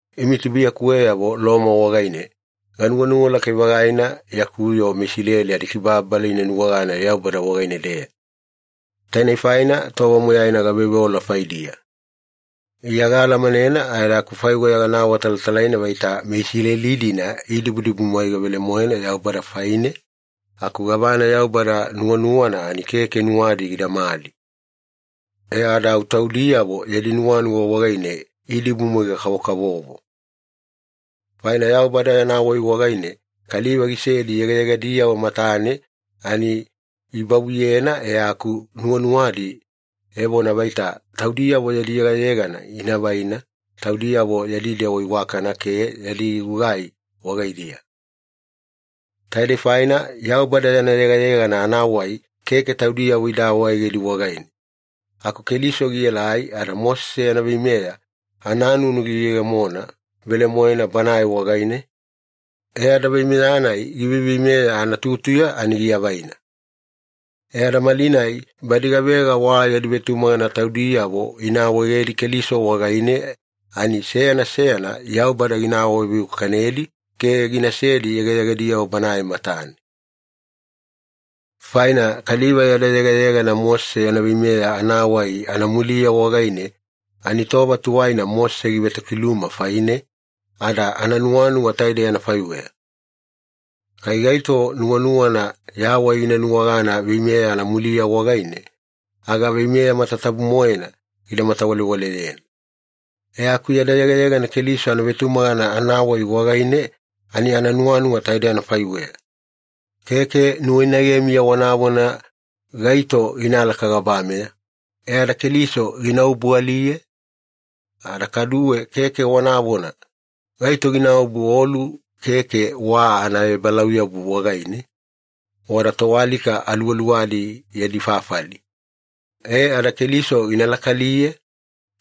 Imi tubuiyakuweyavo Loma wagaine, ganuwanuwa lakai-vagaina yaku yoo meIsileli adikibababala ina nuwagana Yaubada wagaine-deya. Tainei faina tova moyaina gaveoveola faidiya. Iya gaalamanena ada akufaiweya gana awatalatalaina vaita meIsileli-dina idibudibumwaiga velemoena Yaubada faine, aku gavana Yaubada nuwanuwana ani keke nuwadi gidamali. E ada au taudiyavo yadi nuwanuwa wagaine idibumwaiga-kavokavovo. Faina Yaubada yana wai wagaine kaliva gisesedi yegayegadiyavo matane ani ibavuyena, e aku nuwanuwadi evona vaita taudiyavo yadi yegayegana ina vaina taudiyavo yadi dewa iwakana ke yadi gugai wagaidiya. Taidei faina Yaubada yana yegayegana anawai keke taudiyavo ida awaegedi wagaine. Aku Keliso gielai ada Mosese yana veimeya ananunu giyegemona velemoena Banae wagaine, e ada veimeya-nai giveiveimeya anatutuya ani giavaina. E ada malinai badi gavega wa yadi vetumagana taudiyavo ina awaegedi Keliso wagaine, ani seyana seyana Yaubada gina awaveiwakanedi ke ginasedi yegayegadiyavo Banae matane. Faina kaliva yada yegayegana Mosese yana veimeya anawai anamuliya wagaine ani tova tuwaina Mosese givetokiluma faine, ada ananuwanuwa taide anafaiweya. “Kai gaito nuwanuwana yawai gina nuwagana veimeya anamuliya wagaine, aga veimeya matatabu-moena gida matawalewaleyena.” E aku yada yegayegana Keliso anavetumagana anawai wagaine ani ananuwanuwa taide anafaiweya. “Keke nuwainagemiya wanavona, ‘Gaito ginalaka gabameya’” e ada Keliso gina obualiye? “Ada kaduwe keke wanavona, ‘Gaito ginaobu olu keke wa anaebalauyabu wagaine, wada toalika aluwaluwadi yadi fafali’” e ada Keliso gina lakaaliye?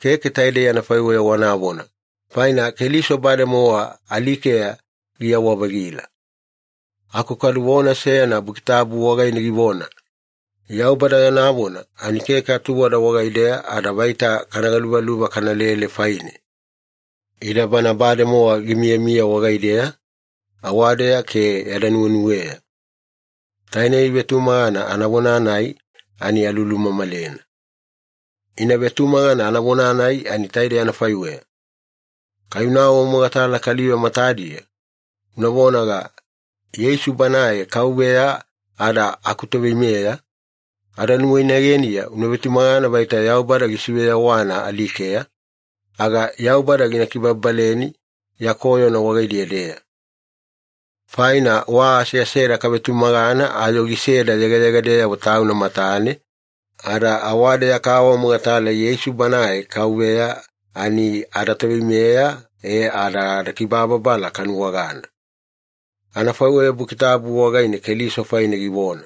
Keke taidei anafaiweya wanavona, faina Keliso bademowa alikeya giyawa-vagila. Aku kadu vona seyana Buki Tabu wagaine givona, “Yaubada yana vona ani keke atuwada wagaideya ada vaita kana galuvaluva kanalele faine. Ida bana bademowa gimiyamiya wagaideya, awadeya ke yada nuwenuweya.” Tainei vetumagana anavona-nai ani alulumamalena. Ina vetumagana anavona-nai ani taidei anafaiweya. Kai una awamogatala kaliva matadiya, una vonaga, “Yeisu Banae Kauveya ada akuToveimeya,” ada nuwainageniya una vetumagana vaita Yaubada gisiveyawana alikeya, aga Yaubada gina kibababaleni ya koyona wagaidiya-deya. Faina wa aseaseda kavetumagana ayo giseda yegayegadeyavo Tauna matane, ada awadeya kaawamogatala Yeisu Banae Kauveya ani adaToveimeya e ada adakibababala kanuwagana. Anafaiweya Buki Tabu wagaine Keliso faine givona,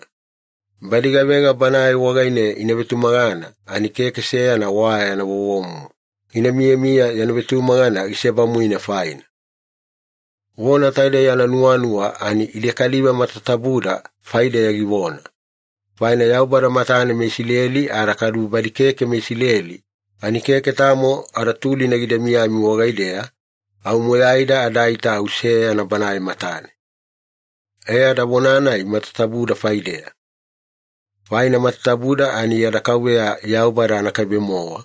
“Badi gavega Banae wagaine ina vetumagana ani keke seyana wa yana vovomumu gina miyamiya yana vetumagana gisebamuina faina.” Vona taidei ananuwanuwa ani ide kaliva matatabuda faideya givona. Faina Yaubada matane meIsileli ada kadu badi keke meIsileli ani keke tamo adatulina gida miyami wagaideya, au moyaida adaita au seyana Banae matane. E ada vona-nai matatabuda faideya. Faina matatabuda ani yada Kauveya Yaubada anakaibe-mowa,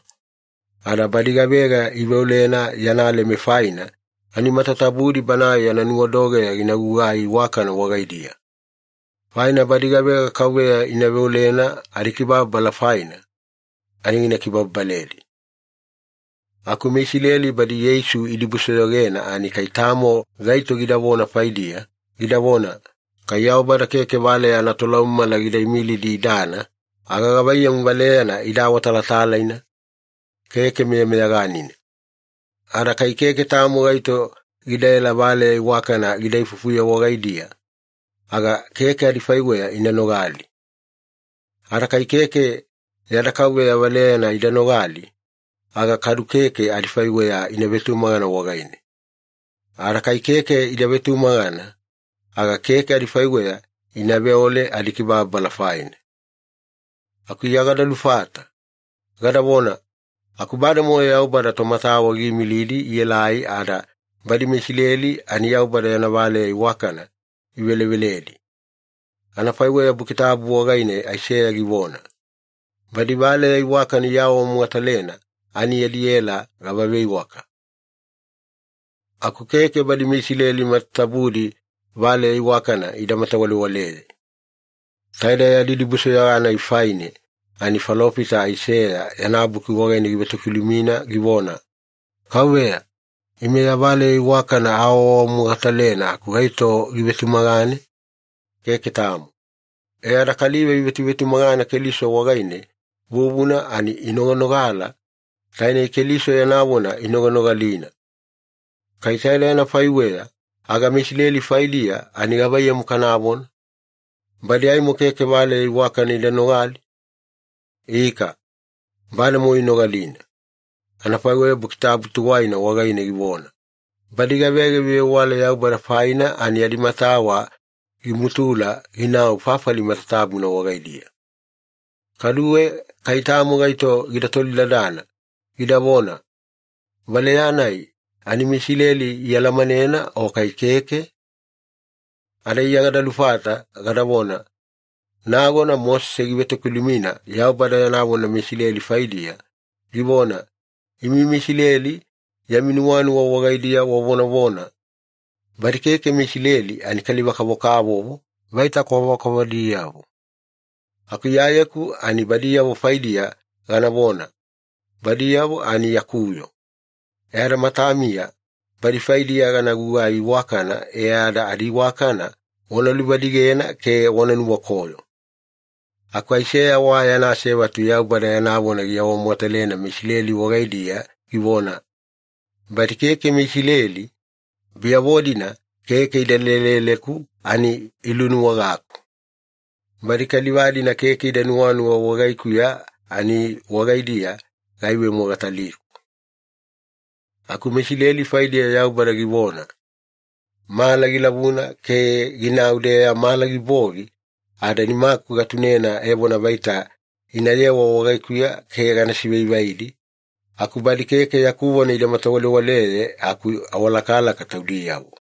ada badi gavega iveolena yana leme faina ani matatabudi Banae yana nuwadogeya gina gugai iwakana wagaidiya. Faina “Badi gavega KAUVEYA ina veolena adikibababala faina, ani gina kibababaledi.” Aku meIsileli badi Yeisu idibusoyogena ani kai tamo gaito gidavona faidiya, gidavona, “Kai Yaubada keke valeya anatolaumamala gida imilidi idana, aga gavaiyamu valeyana ida awatalatalaina? Keke meyameyaganina. Ada kai keke tamo gaito gidaela valeya iwakana gida ifufuye wagaidiya, aga keke adifaiweya ina nogali. Ada kai keke yada Kauveya valeyana ida nogali, aga kadu keke adifaiweya ina vetumagana wagaine. Ada kai keke ida vetumagana, aga keke adifaiweya ina veole adikibababala faina.” Aku Iya gada lufata, gadavona, “Aku bademowa Yaubada tomatawa giimilidi ielai ada badi meIsileli ani Yaubada yana valeya iwakana iveleveledi, anafaiweya Buki Tabu wagaine Aiseya givona, ‘Badi Valeya Iwakana iawaawamogatalena ani yadi ela gava veiwaka!’” Aku keke badi meIsileli matatabudi valeya iwakana ida matawalewaleye. Taide yadi dibusoyoga-nai faine ani falofita Aiseya yana buki wagaine givetokilumina givona, “KAUVEYA, ime ya valeya iwakana aawaawamogatalena aku gaito givetumagane? Keke tamo.” E ada kaliva ivetuvetumagana Keliso wagaine vuvuna ani inoganogala, tainei Keliso yana vona inoganogalina. Kai taidei anafaiweya, aga meIsileli faidiya ani gavaiyamu kanavona? Badi aimo keke valeya iwakana ida nogali? Ika, bademowa inogalina. Anafaiweya Buki Tabu tuwaina wagaine givona, “Badi gavega ivevewala Yaubada faina ani adimatawa gimutula ginau fafali matatabuna wagaidiya.” Kaduwe kai tamo gaito gida tolidadana, gidavona, “Valeya-nai ani meIsileli ialamanena o kai keke?” Ada Iya gada lufata, gadavona, “Nagona Mosese givetokilumina Yaubada yana vona meIsileli faidiya, givona, ‘Imi meIsileli yami nuwanuwa wagaidiya wavonavona, “Badi keke meIsileli ani kaliva-kavokavovo, vaita kwavakwavadiyavo.” Aku Iyayeku ani badiyavo faidiya ganavona, “Badiyavo ani yaku yoo,” e ada matamiya badi faidiya gana gugai iwakana e ada adiiwakana wana luvadigena ke wana nuwakoyo.’” Aku Aiseya wa yana asevatu Yaubada yana vona giawamogatalena meIsileli wagaidiya givona, “Badi keke meIsileli, biyavo-dina keke ida leleleku ani ilunuwagaku. Badi kaliva-dina keke ida nuwanuwa wagaikuya ani wagaidiya gaivemogataliku.” Aku meIsileli faidiya Yaubada givona, “Mala gilavuna ke ginau-deya mala gibogi ada nimaku gatunena evona vaita inayewa wagaikuya ke gana sivaivaidi, aku badi keke yaku vona ida matawalewaleye aku awalakalaka taudiyavo.”